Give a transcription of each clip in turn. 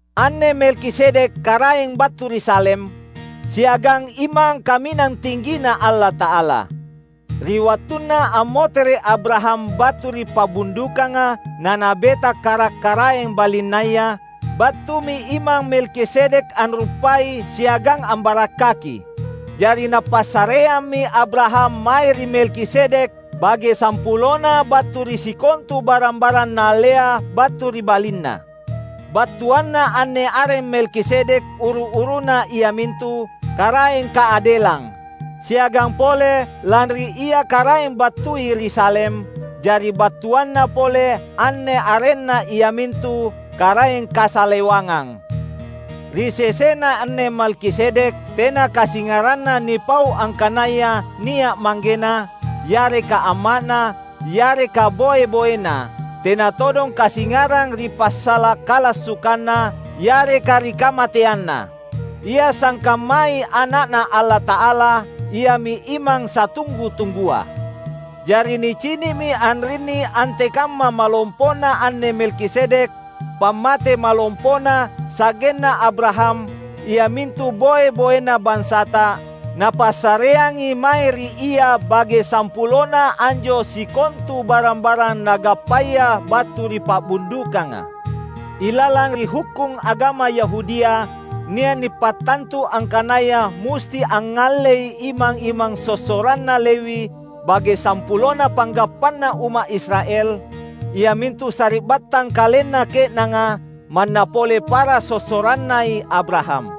Anne Melkisedek karaeng battu ri Salem, siagang imang Kaminang Tinggina Allata’ala. Ri wattunna ammotere’ Abraham battu ri pa’bundukanga nanabeta karak-karaeng balinnaya, battumi Imang Melkisedek anruppai siagang ambarakkaki. Jari napassareammi Abraham mae ri Melkisedek bage sampulona battu ri sikontu barang-barang naallea battu ri balinna. (Battuanna anne areng Melkisedek uru-uruna iamintu, "Karaeng Kaadelang"; siagang pole lanri ia karaeng battui ri Salem, jari battuanna pole anne arenna iamintu "Karaeng Kasalewangang".) Ri sesena anne Melkisedek tena kasingaranna nipau angkanaya nia’ manggena, yareka amma’na, yareka boe-boena; tena todong kasingarang ri passala’ kalassukanna, yareka ri kamateanna. Ia sangkammai Ana’Na Allata’ala; iami imang satunggu-tunggua. Jari nicini’mi anrinni antekamma malompona anne Melkisedek; pammate malompona, sa’genna Abraham, iamintu boe-boena bansata, napassareangi mae ri ia bage sampulona anjo sikontu barang-barang nagappaya battu ri pa’bundukanga. Ilalang ri hukkung agama Yahudia nia’ nipattantu angkanaya musti angngallei imang-imang sossoranna Lewi bage sampulona panggappanna umma’ Israel, iamintu sari’battang kalenna ke’nanga, manna pole para sossorannai Abraham.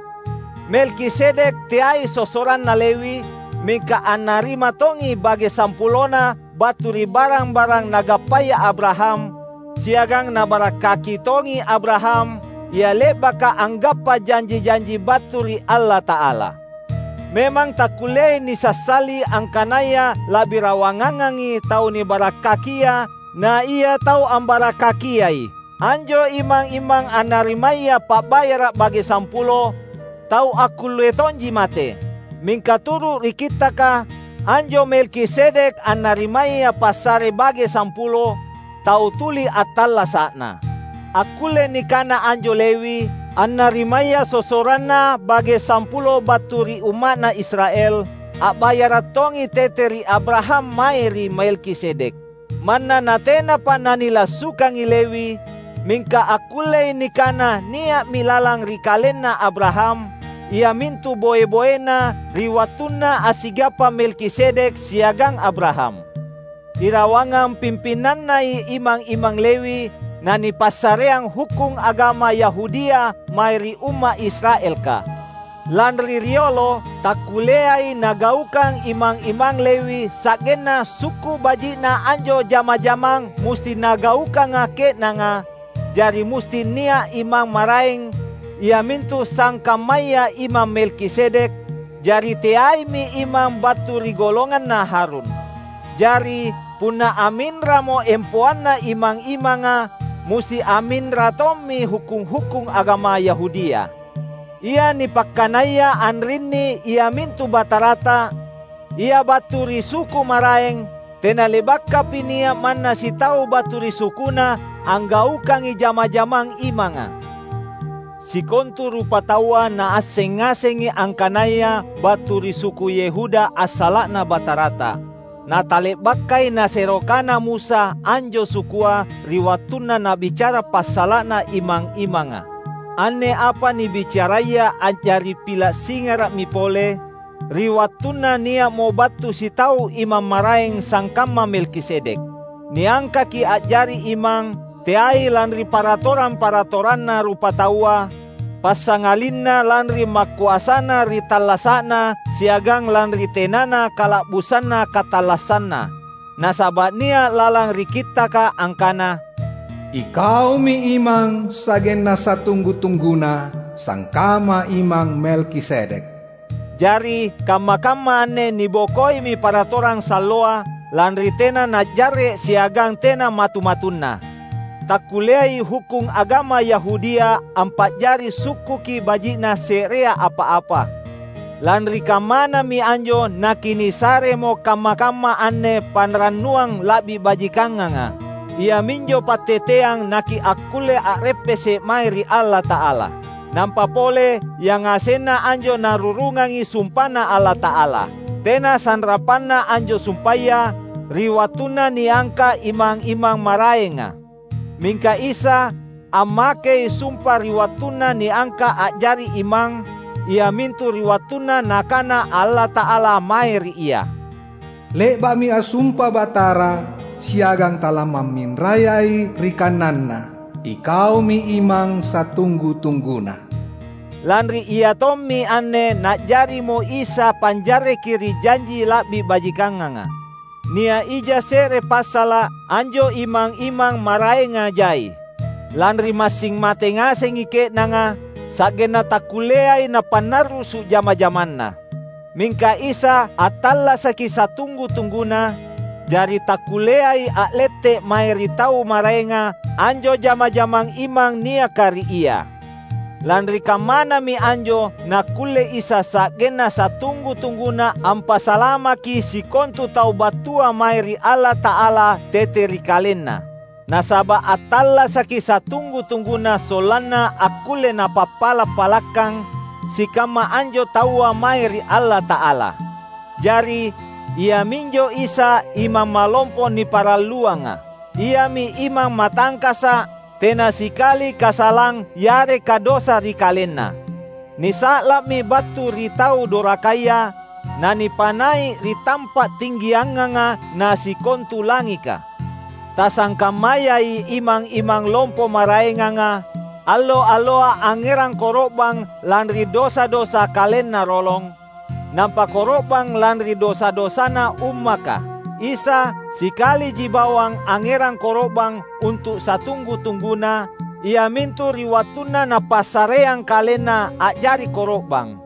Melkisedek teai sossoranna Lewi, mingka annarima tongi bage sampulona battu ri barang-barang nagappaya Abraham, siagang nabarakkaki tongi Abraham, ia le’baka anggappa janji-janji battu ri Allata’ala. Memang takkulleai nisassali angkanaya la’bi rawangangangi tau nibarakkakia na ia tau ambarakkakiai. Anjo imang-imang annarimaya pa’bayara’ bage sampulo, tau akkulle tonji mate. Mingka turu’ ri Kittaka: Anjo Melkisedek annarimaya passare bage sampulo, tau tuli attallasa’na. Akkulle nikana anjo Lewi, annarimaya sossoranna bage sampulo battu ri umma’ Israel, a’bayara’ tongi tete ri Abraham mae ri Melkisedek. Manna natenapa nanilassukangi Lewi, mingka akkullei nikana nia’mi lalang ri kalenna Abraham, iamintu boe-boena, ri wattunna assigappa Melkisedek siagang Abraham. Irawangang pimpinannai imang-imang Lewi nanipassareang hukkung agama Yahudia mae ri umma’ Israelka. Lanri riolo, takkulleai nagaukang imang-imang Lewi sa’genna sukku’ baji’na anjo jama-jamang musti nagaukanga ke’nanga, jari musti nia’ imang maraeng, iamintu sangkammaya Imang Melkisedek; jari teaimi imang battu ri golonganna Harun. Jari, punna amminramo empoanna imang-imanga, musti amminra tommi hukkung-hukkung agama Yahudia. Ia nipakkanaya anrinni iamintu Batarata: Ia battu ri suku maraeng; tena le’bakapi nia’ manna sitau battu ri sukuNa anggaukangi jama-jamang imanga. Sikontu rupataua naasseng ngasengi angkanaya battu ri suku Yehuda assala’Na Batarata; na tale’bakai nasero kana Musa anjo sukua ri wattunna nabicara passala’na imang-imanga. Anne apa nibicaraya a’jari pila’ singara’mi pole, ri wattunna nia’mo battu sitau imang maraeng sangkamma Melkisedek. Niangkaki a’jari imang, teai lanri paratorang-paratoranna rupataua, passangalinna lanri makoasana ri tallasa’na siagang lanri tenana kala’busanna katallassanna. Nasaba’ nia’ lalang ri Kittaka angkana, "Ikaumi imang sa’genna satunggu-tungguna, sangkamma Imang Melkisedek." Jari, kamma-kamma anne nibokoimi paratorang salloa, lanri tena najarre’ siagang tena matu-matunna. Takkulleai hukkung agama Yahudia ampa’jari sukkuki baji’na se’rea apa-apa. Lanri kammanami anjo nakinisaremo kamma-kamma anne panrannuang la’bi bajikanganga; iaminjo patteteang nakiakkulle a’reppese’ mae ri Allata’ala. Nampa pole, yangasenna anjo narurungangi sumpaNa Allata’ala. Tena sanrapanna anjo sumpaya, ri wattunna niangka’ imang-imang maraenga. Mingka Isa, ammakei sumpa ri wattunna niangka’ a’jari imang, iamintu ri wattunna Nakana Allata’ala mae ri Ia, "Le’ba’mi assumpa Batara, siagang talamamminrayai ri kananNa, ‘IKaumi Imang satunggu-tungguna.’" Lanri iatommi anne na’jarimo Isa panjarreki ri janji la’bi bajikanganga. Nia’ ija se’re passala’: anjo imang-imang maraenga jai, lanri massing mate ngasengi ke’nanga, sa’genna takkulleai napannarrusu’ jama-jamanna. Mingka Isa, attallasaki satunggu-tungguna; jari takkulleai a’lette’ mae ri tau maraenga anjo jama-jamang imang niaka ri Ia. Lanri kammanami anjo nakkulle Isa sa’genna satunggu-tungguna ampasalamaki sikontu tau battua mae ri Allata’ala tete ri KalenNa; nasaba’ attallasaki satunggu-tungguna sollanna akkulle Napappala’-palakkang sikamma anjo taua mae ri Allata’ala. Jari, Ia minjo Isa Imang Malompo niparalluanga. Iami Imang matangkasa’; tena sikali kasalang yareka dosa ri KalenNa. Nisa’la’mi battu ri tau dorakaya, na nipanai’ ri tampa’ tinggianganga na sikontu langika. Tasangkammayai imang-imang lompo maraenganga, allo-alloa angngerang koro’bang lanri dosa-dosa kalenna rolong, nampa koro’bang lanri dosa-dosana ummaka. Isa, sikaliji bawang angngerang koro’bang untu’ satunggu-tungguna, iamintu ri wattunna Napassareang KalenNa a’jari koro’bang.